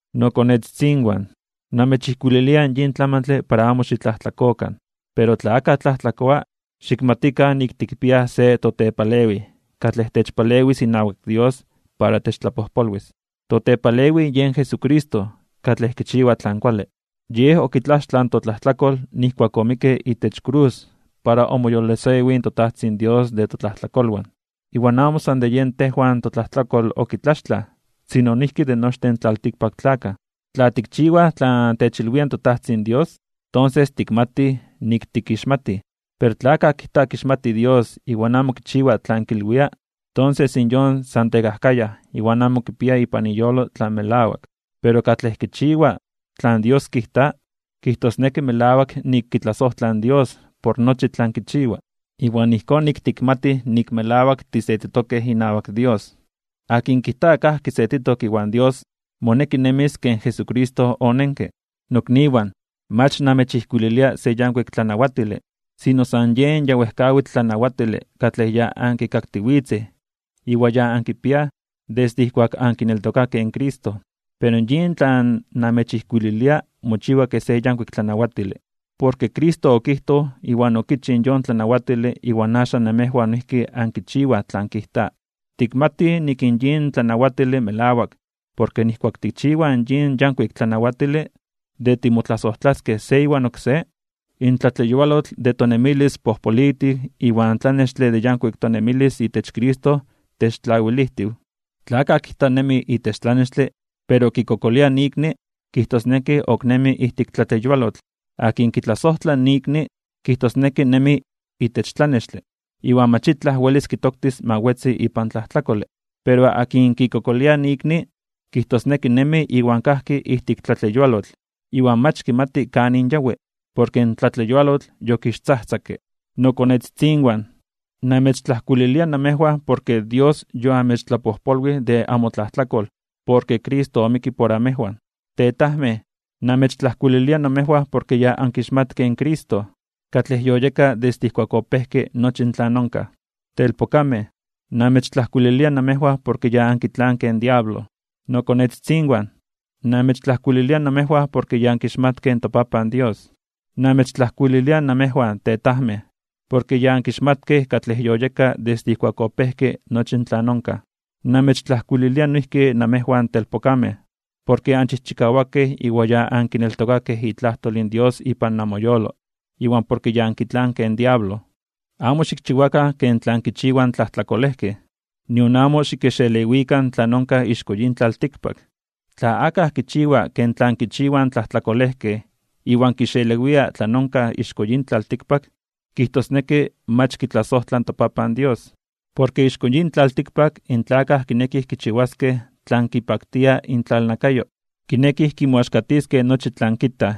Nokonetzitzinwan, namechijkuililia yin tlamantle para amo xitlajtlakokan. Pero tla akaj tlajtlakoa, xikmatikan nik tikpiaj se totepalewij katlej techpalewis inawak Dios para techtlapojpolwis. Totepalewij yen Jesucristo katlej kichiwa tlan kuale. Yej okitlaxtlaj in totlajtlakol nijkuak omikke itech krus para omoyolosewij in toTajtzin Dios de totlajtlakolwan. Iwan amo san de yen tejwan totlajtlakol okitlaxtlaj, sino noijki de nochtin in tlaltikpaktlakaj. Tla tikchiwaj tlan techilwia in toTajtzin Dios, tonses tikmatij nik tikixmatij. Pero tla akaj kijta kixmati Dios iwan amo kichiwa tlan kilwia, tonses in yon san tekajkayaj iwan amo kipia ipan iyolo tlan melawak. Pero katlej kichiwa tlan Dios kijta, kijtosneki melawak nik kitlasojtla in Dios por nochi tlan kichiwa. Iwan ijkón nik tikmatij nik melawak tisetitokej inawak Dios. Akin kijta kajki setitok iwan Dios, moneki nemis ken Jesucristo onenke. Nokniwan, mach namechijkuililia se yankuik tlanawatile, sino san yen ya wejkawitl tlanawatile katlej ya ankikaktiwitzej iwan ya ankipiaj desde ijkuak ankineltokakej in Cristo. Pero yin tlan namechijkuililia mochiwa kej se yankuik tlanawatile, porke Cristo okijtoj iwan okichij yon tlanawatile iwan axan namejwan noijki ankichiwaj tlan kijta. Tikmatij nik in yin tlanawatile melawak porke nijkuak tikchiwaj yin yankuik tlanawatile, de timotlasojtlaskej se iwan oksé, in tlatleyualotl de tonemilis pojpolitiw iwan tlanextle de yankuik tonemilis itech Cristo techtlawilijtiw. Tla akaj kijta nemi itech tlanextle, pero kikokolia ikni, kijtosneki ok nemi ijtik tlatleyualotl. Akin kitlasojtla ikni, kijtosneki nemi itech tlanextle, iwan mach itlaj welis kitoktis ma wetzi ipan tlajtlakole. Pero akin kikokolia ikni, kijtosneki nemi iwan kajki ijtik tlatleyualotl, iwan mach kimati kanin yawi, porke in tlatleyualotl yokixtzajtzakke. Nokonetzitzinwan, namechtlajkuililia namejwan porke Dios yoamechtlapojpolwij de amotlajtlakol porke Cristo omikke por amejwan. Tetajmej, namechtlajkuililia namejwan porke ya ankixmatkej in Cristo katlej yoyeka desde ijkuak opejke nochi tlan onkaj. Telpokamej, namechtlajkuililia namejwan porke ya ankitlankej in diablo. Nokonetzitzinwan, namechtlajkuililia namejwan porke ya ankixmatkej in toPapan Dios. Namechtlajkuililia namejwan, tetajmej, porke ya ankixmatkej katlej yoyeka desde ijkuak opejke nochi tlan onkaj. Namechtlajkuililia noijki namejwan telpokamej, porke anchijchikawakej iwan ya ankineltokakej itlajtol in Dios ipan namoyolo, iwan porke ya ankitlankej in diablo. Amo xikchiwakan ken tlan kichiwaj in tlajtlakolejkej, nion amo xikixelewikan tlan onkaj ixko yin tlaltikpak. Tla akaj kichiwa ken tlan kichiwaj in tlajtlakolejkej iwan kixelewia tlan onkaj ixko yin tlaltikpak, kijtosneki mach kitlasojtla in toPapan Dios. Porke ixko yin tlaltikpak in tlakaj kinekij kichiwaskej tlan kipaktia intlalnakayo, kinekij kimoaxkatiskej nochi tlan kitaj,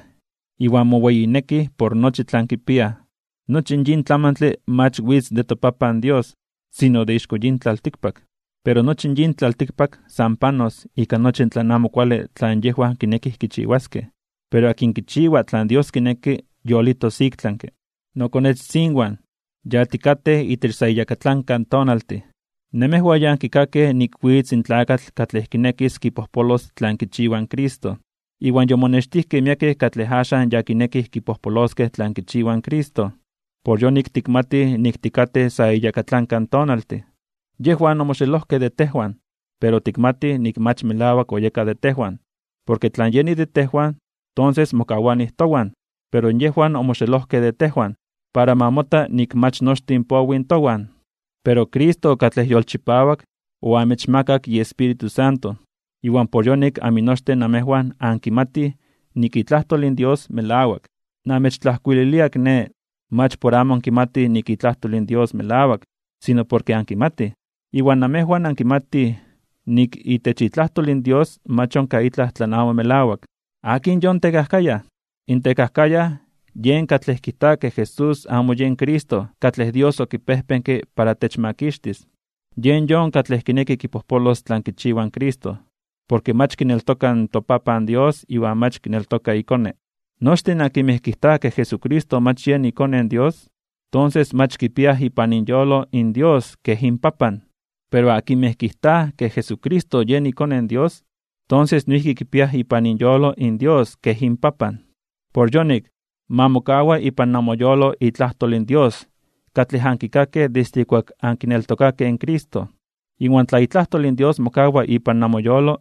iwan moweyinekij por nochi tlan kipiaj. Nochi yin tlamantle mach witz de toPapan Dios, sino de ixko yin tlaltikpak. Pero nochi yin tlaltikpak san panos ika nochi tlan amo kuale tlan yejwan kineki kichiwaskej, pero akin kichiwa tlan Dios kineki yolitos iktlanke (ik tlami). Nokonetzitzinwan, ya tikatej itech sa iyakatlanka tonaltin. Namejwan ya ankikakej nik witz in tlakatl katlej kinekis kipojpolos tlan kichiwa in Cristo. Iwan yomonextijkej miekej katlej axan ya kinekij kipojpoloskej tlan kichiwa in Cristo. Por yonik tikmatij nik tikatej itech sa iyakatlanka tonaltin. Yejwan omoxelojkej de tejwan, pero tikmatij nik mach melawak oyekaj de tejwan, porke tla yenij de tejwan, tonses mokawanij towan. Pero yejwan omoxelojkej de tejwan, para ma mota nik mach nochtin powij towan. Pero Cristo katlej yolchipawak oamechmakak iEspíritu Santo, iwan por yonik aminochtin namejwan ankimatij nik itlajtol in Dios melawak. Namechtlajkuililia kiné, mach por amo ankimatij nik itlajtol in Dios melawak, sino porke ankimatij. Iwan namejwan ankimatij nik itech itlajtol in Dios mach onkaj itlaj tlan amo melawak. ¿Akin yon tekajkayaj? In tekajkayaj yen katlej kijta ke Jesús amo yen Cristo katlej Dios okipejpenke para techmakixtis. Yen yon katlej kineki kipojpolos tlan kichiwa in Cristo, porke mach kineltoka in toPapan Dios iwan mach kineltoka iKone. Nochtin akinmej kijtaj ke Jesucristo mach yen iKone in Dios, tonses mach kipiaj ipan inyolo in Dios kej inPapan. Pero akinmej kijtaj ke Jesucristo yen iKone in Dios, tonses noijki kipiaj ipan inyolo in Dios kej inPapan. Por yonik, ma mokawa ipan namoyolo itlajtol in Dios katlej ankikakej desde ijkuak ankineltokakej in Cristo. Iwan tla itlajtol in Dios mokawa ipan namoyolo,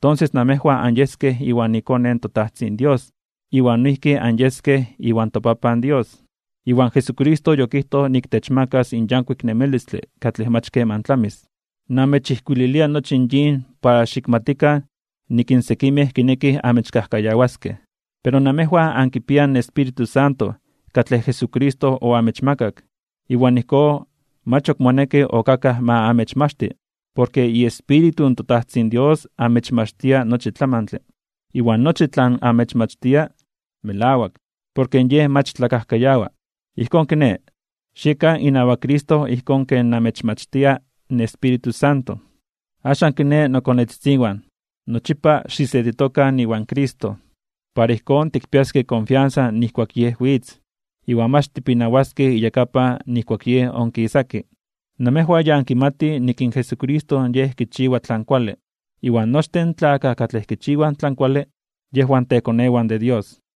tonses namejwan anyeskej iwan iKone in toTajtzin Dios iwan noijki anyeskej iwan toPapan Dios. Iwan Jesucristo yokijtoj nik techmakas in yankuik nemilistle katlej mach keman tlamis. Namechijkuililia nochi in yin para xikmatikan nik in sekimej kinekij amechkajkayawaskej. Pero namejwan ankipiaj in Espíritu Santo katlej Jesucristo oamechmakak. Iwan ijkón mach ok moneki ok akaj ma amechmachti, porke iEspíritu toTajtzin Dios amechmachtia nochi tlamantle. Iwan nochi tlan amechmachtia melawak, porke Yej mach tlakajkayawa. Ijkón kiné, xiekan inawak Cristo ijkón ken namechmachtia in Espíritu Santo. Axan kiné, nokonetzitzinwan, nochipa xisetitokan iwan Cristo, para ijkón tikpiaskej konfiansa nijkuak Yej witz, iwan mach tipinawaskej iyakapan nijkuak Yej onkisaki. Namejwan ya ankimatij nik in Jesucristo Yej kichiwa tlan kuale, iwan nochtin in tlakaj katlej kichiwaj tlan kuale, yejwan tekonewan de Dios.